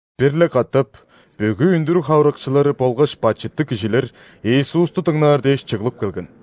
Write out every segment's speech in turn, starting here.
Бир-ле катап бүгү үндүрүг хавырыкчылары болгаш бачыттыг кижилер Иисусту дыңнаар дээш чыглып келген.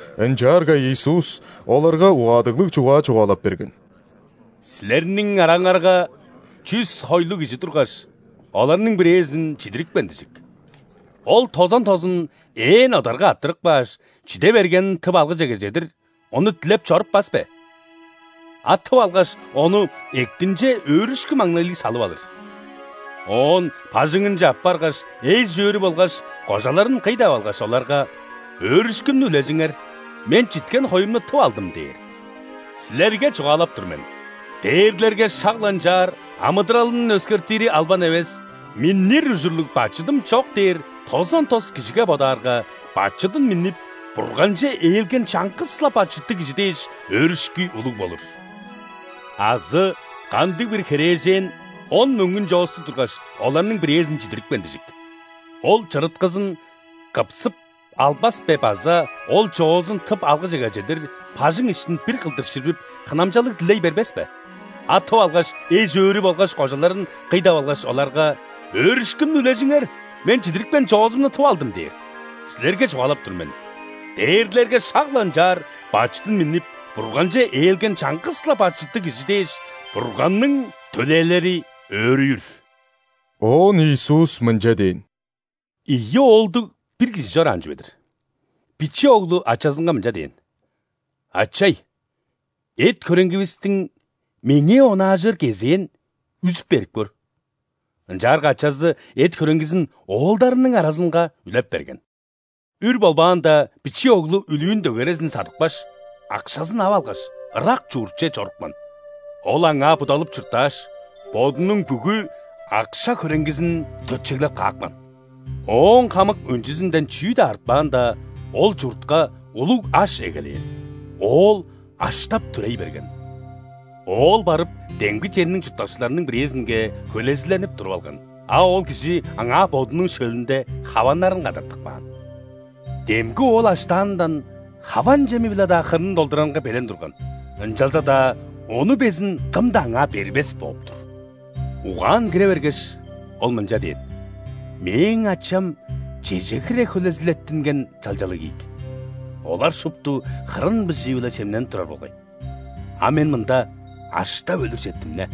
Ынчаарга Иисус оларга угаадыглыг чугаа чугаалап берген: «Силерниң араңарга чүс хойлуг кижи тургаш, оларның бирээзин чидирипкен дижик. Ол тозан тозун ээн одарга арттырып кааш, чиде бергенин тып алгыжеге чедир, ону дилеп чоруппас бе? А тып алгаш, ону эктинче өөрүшкү-маңнайлыг салып алыр. Оон бажыңынче аппаргаш, эш-өөрү болгаш кожаларын кый деп алгаш, оларга: „Өөрүшкүмнү үлежиңер, мен читкен хоюмну тып алдым!“ – дээр. Силерге чугаалап тур мен: дээрлерге шак-ла ынчаар, амыдыралын өскертири албан эвес „Миннир ужурлуг бачыдым чок“ дээр тозан тос кижиге бодаарга, бачыдын миннип, Бурганче ээлген чаңгыс-ла бачыттыг кижи дээш, өөрүшкү улуг болур». «Азы кандыг-бир херээжен он мөңгүн чоостуг тургаш, оларның бирээзин чидирипкен дижик. Ол чырыткызын кыпсып албас бе база, ол чоозун тып алгыжеге чедир, бажың иштин бир кылдыр ширбип, хынамчалыг дилей бербес бе? А тып алгаш, эш-өөрү болгаш кожаларын кый деп алгаш, оларга: „Өөрүшкүмнү үлежиңер, мен чидирипкен чоозумну тып алдым“ – дээр. Силерге чугаалап тур мен: дээрлерге шак-ла ынчаар, бачыдын миннип, Бурганче ээлген чаңгыс-ла бачыттыг кижи дээш, Бурганның төлээлери өөрүүр». Оон Иисус мынча дээн: «Ийи оолдуг бир кижи чораан чүве-дир. Биче оглу ачазынга мынча дээн: „Ачай! Эт-хөреңгивистиң меңээ онаажыр кезээн үзүп берип көр“. Ынчаарга ачазы эт-хөреңгизин оолдарының аразынга үлеп берген. Үр болбаанда, биче оглу үлүүн дөгерезин садыпкаш, акшазын ап алгаш, ырак чуртче чорупкан. Ол аңаа будалып чурттааш, бодунуң бүгү акша-хөреңгизин төтчеглеп каапкан. Ооң хамык өнчүзүнден чүү-даа артпаанда, ол чуртка улуг аш эгелээн, оол аштап-түрей берген. Оол барып, демги черниң чурттакчыларының бирээзинге хөлезиленип туруп алган, а ол кижи аңаа бодунуң шөлүнде хаваннарын кадартып каан. Демги оол аштаанындан хаван чеми-биле-даа хырнын долдурарынга белен турган, ынчалза-даа ону безин кым-даа аңаа бербес бооп-тур. Угаан кире бергеш, ол мынча дээн: „Мээң ачам чеже хире хөлезилеттинген чалчалыг ийик, олар шупту хырын быжыы-биле чемненип турар болгай, а мен мында аштап өлүр четтим-не!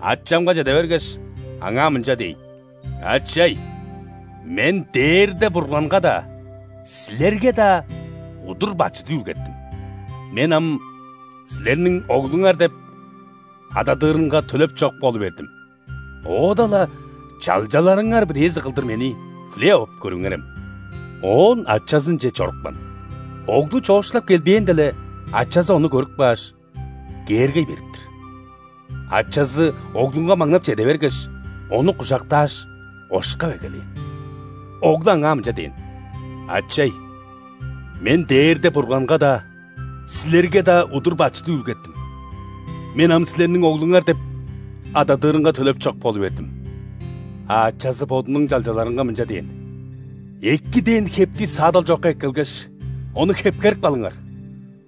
Ачамга чеде бергеш, аңаа мынча дээйн: ‘Ачай! Мен дээрде Бурганга-даа, силерге-даа удур бачыт үүлгеттим. Мен ам силерниң оглуңар деп ададырынга төлеп чок болу бердим, оода-ла чалчаларыңар бирээзи кылдыр мени хүлээп ап көрүңерем’“. Оон ачазынче чорупкан. Оглу чоокшулап келбээнде-ле, ачазы ону көрүп кааш, кээргей берип-тир. Ачазы оглунга маңнап чеде бергеш, ону кужактааш, ошкап эгелээн. Оглу аңаа мынча дээн: „Ачай! Мен дээрде Бурганга-даа, силерге-даа удур бачыт үүлгеттим. Мен ам силерниң оглуңар деп ададырынга төлеп чок болу бердим“. А ачазы бодунуң чалчаларынга мынча дээн: „Эки дээн хепти саадал чокка эккелгеш, ону хепкерип калыңар,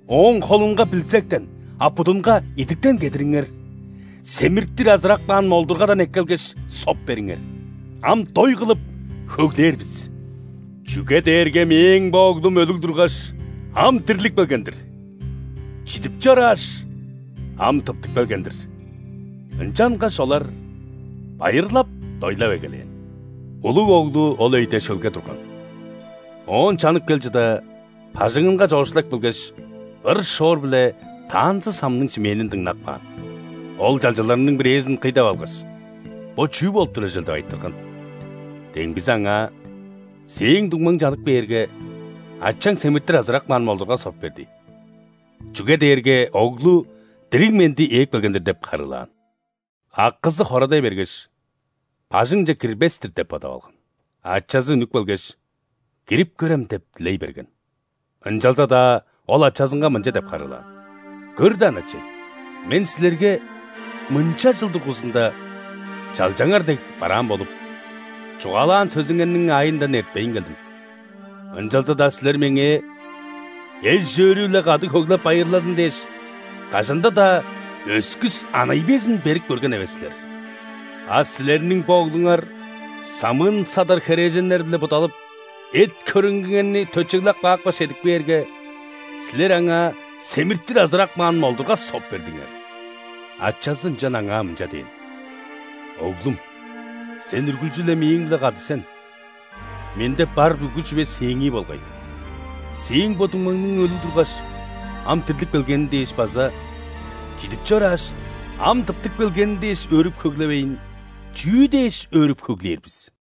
ооң холунга билзектен, а будунга идиктен кедириңер. Семиртир азырап каан молдургадан эккелгеш, соп бериңер: ам дой кылып, хөглээр бис. Чүге дээрге мээң бо оглум өлүг тургаш, ам дирлип келген-дир, чидип чорааш, ам тыптып келген-дир“. Ынчангаш олар байырлап-дойлап эгелээн. Улуг оглу ол өйде шөлге турган, оон чанып кел чыда, бажыңынга чоокшулап келгеш, ыр-шоор биле танцы-самның шимээнин дыңнап каан. Ол чалчаларның бирээзин кый деп алгаш: „Бо чүү болуп турар чүвел?“ – деп айтырган. Демгизи аңаа: „Сээң дуңмаң чанып кээрге, ачаң семиртир азырап каан молдурга соп берди, чүге дээрге оглу дириг-менди ээп келген-дир“ – деп харыылаан. Акызы хорадай бергеш, бажыңче кирбес-тир деп бодап алган. Ачазы үнүп келгеш: „Кирип көрем“ – деп дилей берген. Ынчалза-даа ол ачазынга мынча деп харыылаан: „Көр даан, ачай, мен силерге мынча чыл дургузунда чалчаңар дег бараан болуп, чугаалаан сөзүңерниң аайындан эртпейн келдим, ынчалза-даа силер меңээ, эш-өөрү-биле кады хөглеп-байырлазын дээш, кажанда-даа өскүс анай безин берип көрген эвес силер. А силерниң бо оглуңар самыын-садар херээженнер-биле будалып, эт-хөреңгиңерни төтчеглеп каапкаш чедип кээрге, силер аңаа семиртир азырап каан молдурга соп бердиңер!“ Ачазы ынчан аңаа мынча дээн: „Оглум! Сен үргүлчү-ле мээң-биле кады сен, менде бар бүгү чүве сээңии болгай. Сээң бо дуңмаңның өлүг тургаш, ам дирлип келгени дээш база чидип чорааш, ам тыптып келгени дээш өөрүп-хөглевейн, чүү дээш өөрүп-хөглээр бис?!“»